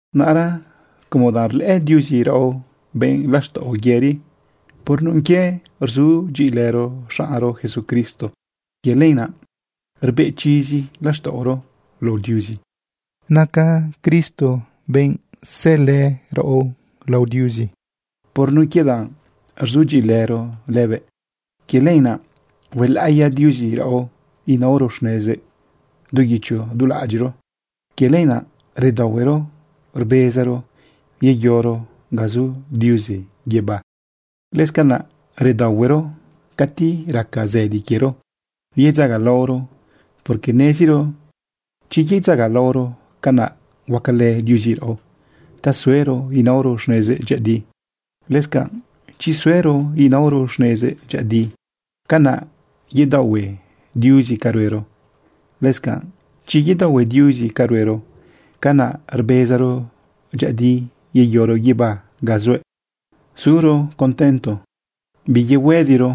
Naꞌra como danꞌ rlëꞌë Diuzi raꞌo benꞌ laxtaꞌo yëri por nun quie rzudyiꞌilëro xaꞌnro Jesucristo, quie lenaꞌ rbeꞌ chizi laxtaꞌoro lao Diuzi. Naca Cristo benꞌ sëlë raꞌo lao Diuzi por nun quie danꞌ rzudyiꞌilëro lëbëꞌ. Quie lenaꞌ huelaꞌiya Diuzi raꞌo inaoro xnezëꞌ du guicho du laꞌadyiꞌro. Quie lenaꞌ redaohuero rbezaro yeyoro ga zu Diuzi guibá. Lëscanaꞌ redaohuero cati raca zëdi quiero yedzagalaoro, porque neziro chi yedzagalaoro, canaꞌ huacalë Diuzi raꞌo ta suero inaoro xnezëꞌ dyëꞌëdi. Lëscanꞌ chi suero inaoro xnezëꞌ dyëꞌëdi, canaꞌ yedaohue Diuzi ca ruero. Lëscanꞌ chi yedaohue Diuzi ca ruero, canaꞌ rbezaro dyëꞌëdi yeyoro guibá ga zuëꞌ. Zuro contento biyehuëdiro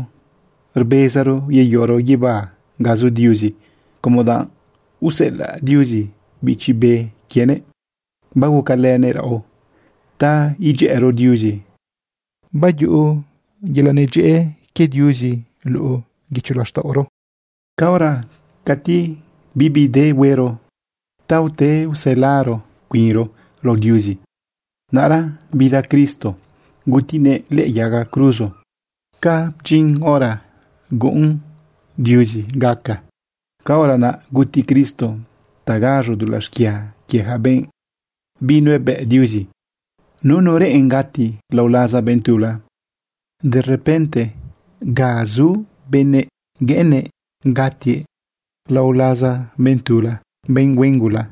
rbezaro yeyoro guibá ga zu Diuzi como danꞌ useꞌelaꞌ Diuzi Bichi Be quienëꞌ, bagucalënëꞌ raꞌo ta idyëꞌëro Diuzi, bayuꞌuro yelaꞌ nedyëꞌë quie Diuzi luꞌu guicho laxtaꞌoro. Caora cati bibi de huero ta ute uselaro cuinro lao Diuzi, naꞌra bida Cristo gutinëꞌ lëꞌë yaga cruzo. Ca bdyin hora guꞌun Diuzi gaca, caora naꞌ guti Cristo ta gaz̃o dulaꞌ xquia quie ja benꞌ binuebëꞌ Diuzi. Nunu reꞌen gati lao laza benꞌ tula. Derepente ga zu benëꞌ gueꞌennëꞌ gatiëꞌ lao laza benꞌ tula, benꞌ huen gula.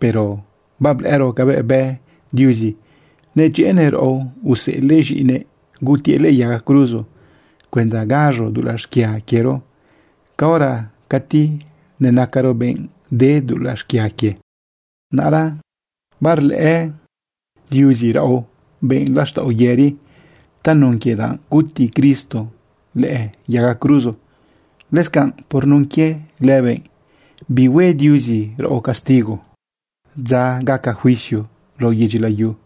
Pero bablëꞌëro cabëꞌ bë Diuzi nedyëꞌënëꞌ raꞌo useꞌelëꞌ z̃iꞌinëꞌ gutiëꞌ lëꞌë yaga cruzo cuenda gaz̃o dulaꞌ xquia quiero caora cati nenacaro benꞌ de dulaꞌ xquia quie. Naꞌra barlëꞌë Diuzi raꞌo benꞌ laxtaꞌo yëri tanun quie danꞌ guti Cristo lëꞌë yaga cruzo. Lëscanꞌ por nun quie lëbëꞌ bihue Diuzi raꞌo castigo dza gaca juicio lao yedyi layu.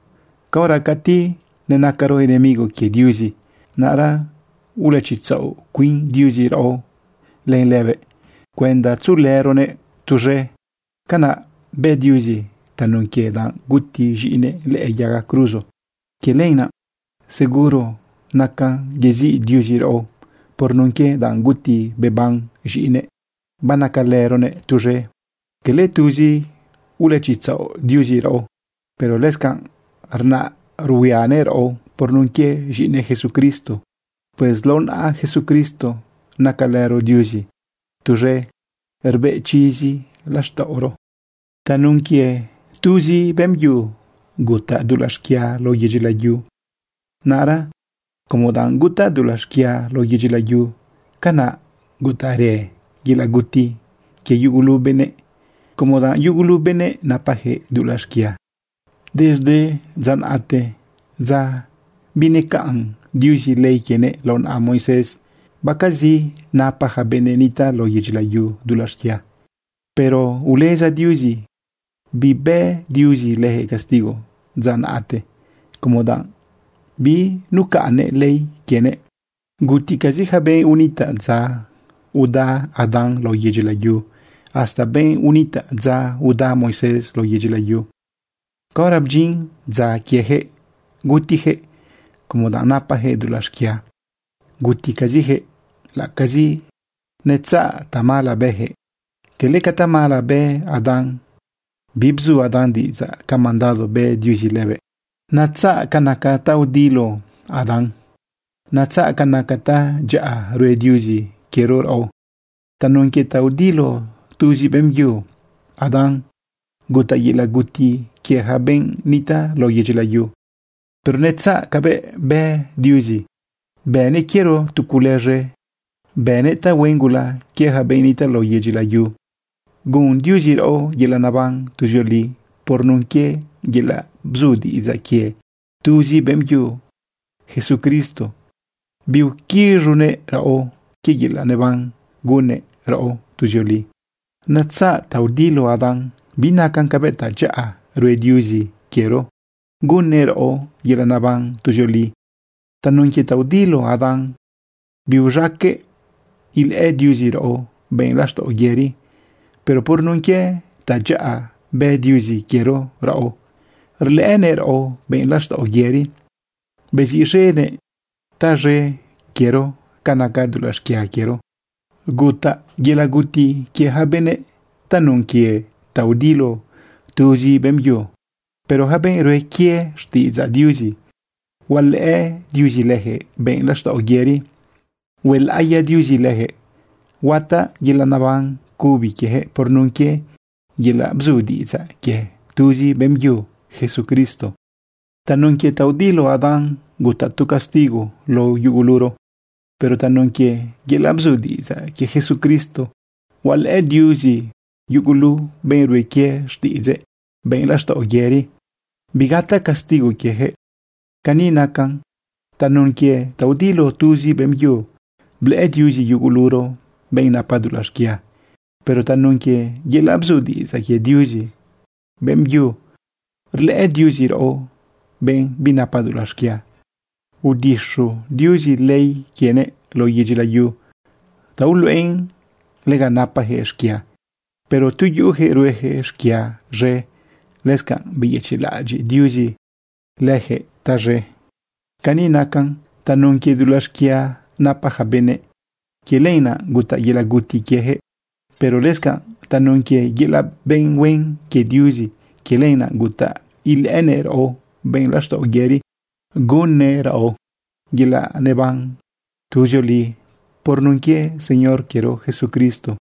Caora cati nenacaro enemigo quie Diuzi, naꞌra ulëchitzaꞌo cuin Diuzi raꞌo len lëbëꞌ cuenda tzuꞌulëronëꞌ tuz̃e. Canaꞌ bë Diuzi tanun quie danꞌ guti z̃iꞌinëꞌ lëꞌë yaga cruzo. Quie lenaꞌ seguro nacan yeziꞌ Diuzi raꞌo por nun quie danꞌ guti beban z̃iꞌinëꞌ, banacalëronëꞌ tuz̃e. Cala tuzi ulëchitzaꞌo Diuzi raꞌo, pero lëscanꞌ rnaꞌ ruhuianëꞌ raꞌo por nun quie z̃iꞌinëꞌ Jesucristo. Pues lao naꞌa Jesucristo nacalëro Diuzi tuz̃e rbeꞌ chizi laxtaꞌoro. Tanun quie tuzi beꞌmbyu gutaꞌ dulaꞌ xquia lao yedyi layu. Naꞌra como danꞌ gutaꞌ dulaꞌ xquia lao yedyi layu, canaꞌ gutaꞌrë yelaꞌ guti quie yugulu benëꞌ, como danꞌ yugulu benëꞌ napajëꞌ dulaꞌ xquia. Desde dza naꞌte, dza binecaꞌn Diuzi ley quienëꞌ lao naꞌa Moisés, baquezi napa yaca benꞌ nitaꞌ lao yedyi layu dulaꞌ xquia. Pero uleza Diuzi bibë Diuzi leyaquëꞌ castigo dza naꞌte como danꞌ binucaꞌnnëꞌ ley quienëꞌ. Guticazi yaca benꞌ unitaꞌ dza uda Adán lao yedyi layu hasta benꞌ unitaꞌ dza uda Moisés lao yedyi layu. Caora bdyin dza quieyaquëꞌ gutiyaquëꞌ como danꞌ napajëꞌ dulaꞌ xquia. Guticaziyaquëꞌ laꞌ acazi netzaꞌ tamala bëyaquëꞌ cala ca tamala bë Adán. Bibzu Adán diꞌidzaꞌ ca mandado bë Diuzi lëbëꞌ. Netzaꞌ ca naca ta udiloꞌ Adán. Netzaꞌ ca naca tadyaꞌa rue Diuzi quiero raꞌo. Tanun quie ta udiloꞌ tuzi beꞌmbyu Adán gutaꞌ yelaꞌ guti quie ja benꞌ nitaꞌ lao yedyi layu. Pero netzaꞌ cabëꞌ bë Diuzi, bënëꞌ quiero tu cule z̃e. Bënëꞌ tahuen gula quie yaca benꞌ nitaꞌ lao yedyi layu. Gun Diuzi raꞌo yelaꞌ neban tuzioli por nun quie yelaꞌ bzu diꞌidzaꞌ quie tuzi beꞌmbyu Jesucristo. Biuquiz̃unëꞌ raꞌo quie yelaꞌ naban gunnëꞌ raꞌo tuzioli. Netzaꞌ ta udiloꞌ Adán, binacan cabëꞌ tadyaꞌa rue Diuzi quiero gunnëꞌ raꞌo yelaꞌ neban tuzioli. Tanun quie ta udiloꞌ Adán, biuz̃aqueꞌ ilëꞌë Diuzi raꞌo benꞌ laxtaꞌo yëri. Pero por nun quie tadyaꞌa bë Diuzi quiero raꞌo, rlëꞌënëꞌ raꞌo benꞌ laxtaꞌo yëri, beziꞌz̃enëꞌ taz̃e quiero ca naca dulaꞌ xquia quiero. Gutaꞌ yelaꞌ guti quie yaca benëꞌ tanun quie ta udiloꞌ tuzi beꞌmbyu. Pero yaca benꞌ rue quie xtiꞌidzaꞌ Diuzi, hualëꞌë Diuzi leyaquëꞌ benꞌ laxtaꞌo yëri, huelaꞌiya Diuzi leyaquëꞌ, huataꞌ yelaꞌ neban cubi quieyaquëꞌ por nun quie yelaꞌ bzu diꞌidzaꞌ quie tuzi beꞌmbyu Jesucristo. Tanun quie ta udiloꞌ Adán gutaꞌ tu castigo lao yuguluro. Pero tanun quie yelaꞌ bzu diꞌidzaꞌ quie Jesucristo, hualëꞌë Diuzi yugulu benꞌ rue quie xtiꞌidzëꞌ benꞌ laxtaꞌo yëri, bigataꞌ castigo quieyaquëꞌ. Cani nacan. Tanun quie ta udiloꞌ tuzi beꞌmbyu, blëꞌë Diuzi yuguluro benꞌ napa dulaꞌ xquia. Pero tanun quie yelaꞌ bzu diꞌidzaꞌ quie tuzi beꞌmbyu, rlëꞌë Diuzi raꞌo benꞌ binapa dulaꞌ xquia. Udixu Diuzi ley quienëꞌ lao yedyi layu ta uluꞌen lega napajëꞌ xquia. Pero tu yuꞌuyaquëꞌ rueyaquëꞌ xquia z̃e, lëscanꞌ beyëchiꞌlaꞌadyiꞌ Diuzi leyaquëꞌ taz̃e. Cani nacan. Tanun quie dulaꞌ xquia napa yaca benëꞌ, quie lenaꞌ gutaꞌ yelaꞌ guti quiejëꞌ. Pero lëscanꞌ tanun quie yelaꞌ benꞌ huen quie Diuzi, quie lenaꞌ gutaꞌ ilëꞌënëꞌ raꞌo benꞌ laxtaꞌo yëri, hueꞌnëꞌ raꞌo yelaꞌ neban tuzioli por nun quie Señor quiero Jesucristo.